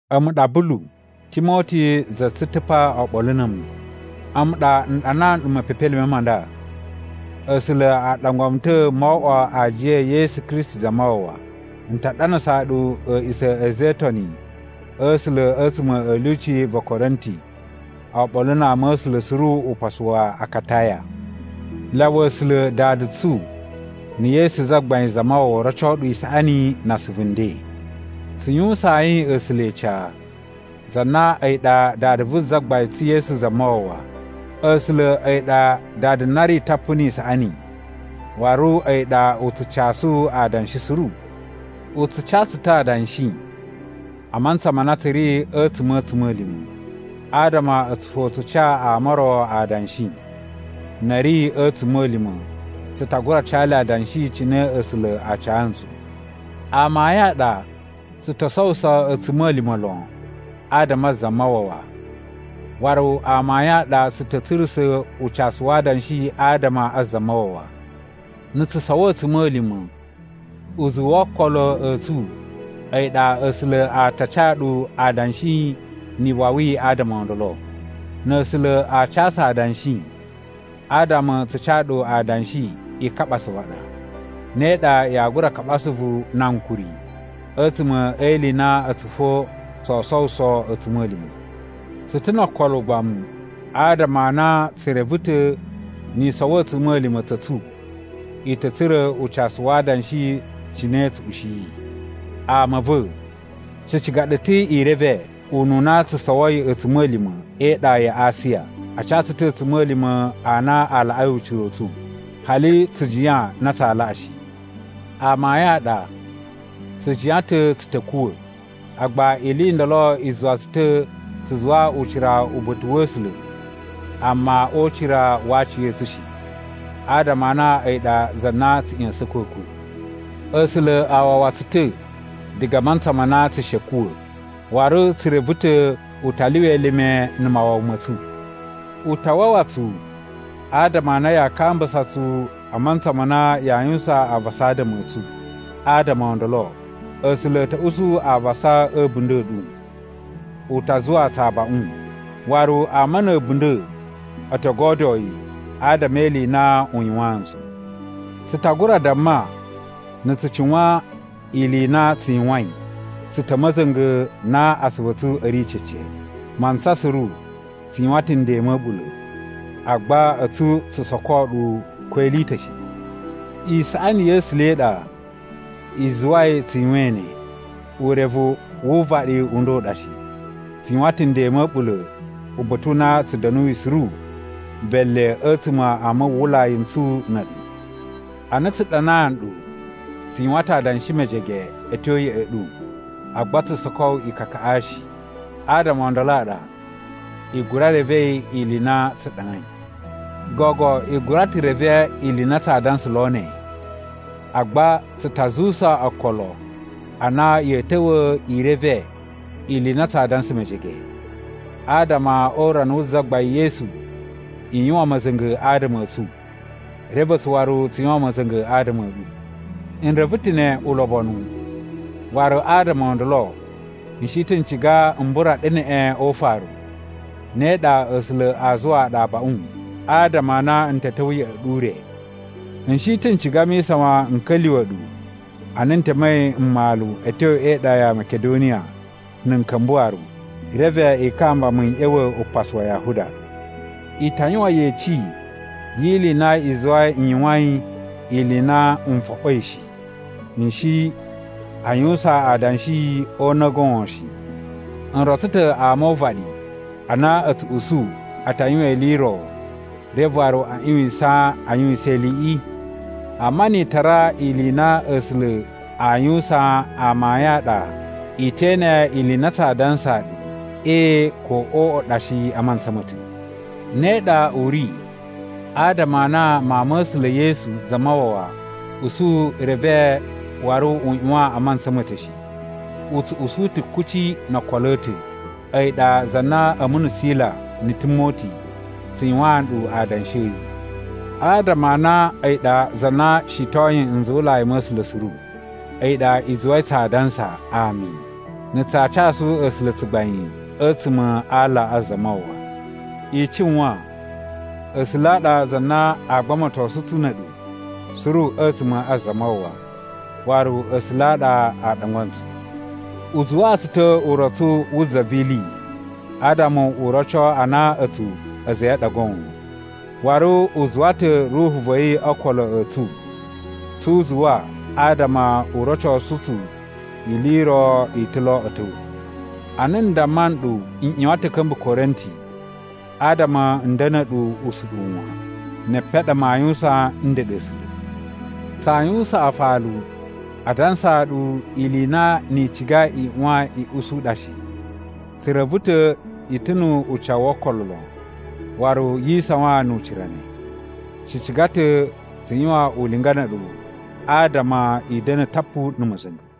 A̱mu ɗa Bulu, Timoti za tsu ta̱ pa oɓolo na̱ a̱mu. A̱mu ɗa n ɗanaa nɗu mepepelime ma nda. A̱sula̱ a ɗangwa mu ta̱ mo oꞌwo aajiya e Yesu Kristi Zamawawa. N ta ɗanasaa ɗu a̱a̱ꞌisa̱ a̱ a̱za̱ e Itoni a̱ A̱sula̱ a̱tsuma̱ a̱ lyuci va̱ Korinti oɓolo na ama a̱ A̱sula̱ suru upasu wa Akataya. Lyawa A̱sula̱ Dada tsu na̱ Yesu Zagbain Zamawawa roco ɗu isaꞌani na asuvu nden. Tsu yuwusayin A̱sula̱ ica, za na a̱yi ɗa Dada vu Zagbain tsu Yesu Zamawawa! A̱sula̱ a̱yi ɗa Dada na ri tapu ni isaꞌani waru a̱yi ɗa u tsu casu adanshi suru. U tsu ca tsu ta̱ adanshi a mantsa ma na tsu ri a̱tsuma̱ a̱ a̱tsuma̱lima̱, adama a̱tsu fo tsu ca ama o ro adanshi. Na̱ a̱ ri a̱ a̱tsuma̱lima̱ tsu ta gura ca le adanshi cine A̱sula̱ a ca ntsu. Amayun a ɗa tsu to sowuso a̱tsuma̱lima̱ lon adama a Zamawawa. Waru amayun a ɗa tsu ta̱ tsurusa̱ ucasu wa adanshi adama a Zamawawa. Na̱ tsu sowo a̱tsuma̱lima̱, uzuwu wo okolo a̱ tsu a̱yi ɗa A̱sula̱ a ta ca ɗu adanshi ni iwawi adama o ndolo. Na̱ A̱sula̱ a ca tsu adanshi, adama tsu ca ɗu adanshi i kaɓa asuvu a ɗa. Ne ɗa yaa gura kaɓa asuvu na ankuri a̱tsuma̱ e ili i na a̱tsu fo tsoo sowuso a̱tsuma̱lima̱. Tsu ta̱ no okolo ugbamu adama a na tsu reve ta̱ ni i sowo a̱tsuma̱lima̱ tsa̱ tsu, i ta̱ tsura̱ ucasu wa adanshi cine tsu ushiyi. Ama a̱ va̱, tsu ciga ɗu ta̱ i reve ununa tsu sowoi a̱tsuma̱lima̱ e iɗa ya Asiya. A ca tsu ta̱ a̱tsuma̱lima̱ a na a laꞌai ucira u tsu, hali tsu jiyan na tsaa laꞌa shi. Amayun a ɗa, tsu jiyan ta̱ tsu ta̱ kuwa̱. Agba ili i ndolo i zuwa tsu ta̱ tsu zuwa ucira uba̱ta̱ wa̱ A̱sula̱ amma o ucira wa aciya̱tsu shi, adama a na a̱yi ɗa za na tsu ꞌya̱sa̱n a̱kwa̱kwa̱. A̱sula̱ a wawa tsu ta̱ diga a mantsa ma na tsu shi a̱ kuwa̱, waru tsu reve ta̱ u ta lyuwa elime na̱ mawawa ma̱ tsu. U ta wawa tsu adama a na yaa kambusa tsu a mantsa ma na yaa yuwusan avasa adama a̱ tsu. Adama o ndolo, A̱sula̱ a̱ ta̱ usu avasa a̱ a̱bunda̱ a̱ ɗu. U ta zuwaa tsu abaꞌun, waru ama na̱ a̱bunda̱ o to godyoo yi adama e ili i na u yuwaan ntsu. Tsu ta gura damma na̱ tsu cuwan ili i na tsu yuwain, tsu ta̱ a̱ ma̱za̱nga̱ na asuvu a̱ tsu a̱ ri cece. Mantsa suru tsu yuwan ta̱ nden ma̱ a̱ɓula̱, agba a̱tsu tsu soko ɗu ko ili i ta̱ shi. Isaꞌani ya̱ A̱sula̱ i ɗa i zuwai tsu yuwain ne, urevu wu uvaɗi u nda u ɗa shi. Tsu yuwan ta̱ nden ma̱ a̱ɓula̱ uba̱ta̱ u na tsu da̱nuyi suru bele a̱tsuma̱ a muwwulai n tsu na̱ a̱ɗu. Ana tsu ɗanaa nɗu, tsu yuwan ta̱ adanshi mejege a̱ tyo ya̱ꞌa̱ ɗu, agba tsu soko ikakaꞌa shi. Adama o ndolo a ɗa, i gura revei ili i na tsu ɗanai. Gogo i gura ta̱ reve ili i na tsaa dansa lo ne, agba tsu ta zuwusa okolo a na ya̱a̱ ta̱wa̱ i reve ili i na tsaa dansa mejege, adama o urana wu Zagbain Yesu i yuwan ma̱za̱nga̱ adama a̱ tsu, reve a̱tsu waru tsu yuwan ma̱za̱nga̱ adama a̱ ɗu. N reve ta̱ ne ulobonu, waru adama o ndolo, n shi ta̱ n ciga m bura ɗu neꞌen o ufaru. Ne ɗa A̱sula̱ a zuwaa ɗu abaꞌun adama a na n ta̱ ta̱wa̱ ya̱ꞌa̱ ɗu ure. N shi ta̱ n ciga mi isawan n ka̱lyuwa̱ ɗu ana n temei mmalu a̱ tyo e iɗa ya Makidoniya na̱ n ka̱mba̱ waru. Reve i kamba mu n ꞌya̱wa̱ upasu wa Yahuda. I ta yuwan yeci yi ili i na i zuwai n yuwain ili i na n foɓoi shi. N shi a yuwusan adanshi o una̱ goon shi. N rotso ta̱ ama o uvaɗi a na a̱ tsu usu a ta yuwan ili i ro reve waru a ꞌyuwisan a yuwisan iliꞌi? Amma ni i tara ili i na A̱sula̱ aa yuwusan amayun a ɗa, i te ene ili i na tsaa dansaa ɗu “Ee” ko “Oꞌo” ɗa shi a mantsa ma̱ ta̱. Ne ɗa u ri adama a na Mawun ma̱ A̱sula̱, Yesu Zamawawa usu reve waru u ꞌyuwan a mantsa ma̱ ta̱ shi. U tsu usu ta̱ kuci no okolo a̱ ta̱. A̱yi ɗa za na a̱mu na̱ Sila na̱ Timoti tsu yuwaan ɗu adanshi a̱ yi. Adama a na a̱yi ɗa za na shitoyin nzuwulai ma̱ A̱sula̱ suru. A̱yi ɗa i zuwai tsaa dansa “Ami” na̱ tsaa casu A̱sula̱ tsugbain a̱tsuma̱ a aala a Zamawawa. I cuwan, A̱sula̱ a ɗa za na aa gbamatosu tsu na̱ a̱ɗu suru a̱tsuma̱ a Zamawawa. Waru A̱sula̱ a ɗa a ɗangwa ntsu. U zuwaa tsu ta̱ urotsu wu za vi ili adama u roco a na a̱tsu a̱za̱ a̱ yi a ɗa goon. Waru u zuwa ta̱ Ruhu va̱ yi o okolo a̱ tsu tsu uzuwa adama u rocosu tsu ili i ro i ta̱ lo a̱ ta̱wa̱. Ana n damma nɗu n ꞌyuwan ta̱ a̱ ka̱mba̱ Korinti adama n da̱na̱ ɗu usuɗuwu wan. Ne epen a ɗa maa yuwusan ndeɗe A̱sula̱. Tsaa yuwusan afalu a dansaa ɗu ili i na ni i ciga i ꞌyuwan i usu ɗa shi. Tsu reve ta̱ i ta̱ nu ucawu wo okolo lon waru yi isawan nu ucira ne. Tsu ciga ta̱ tsu yuwan ulinga na̱ a̱ɗu adama i da̱na̱ tapu na̱ ma̱za̱nga̱.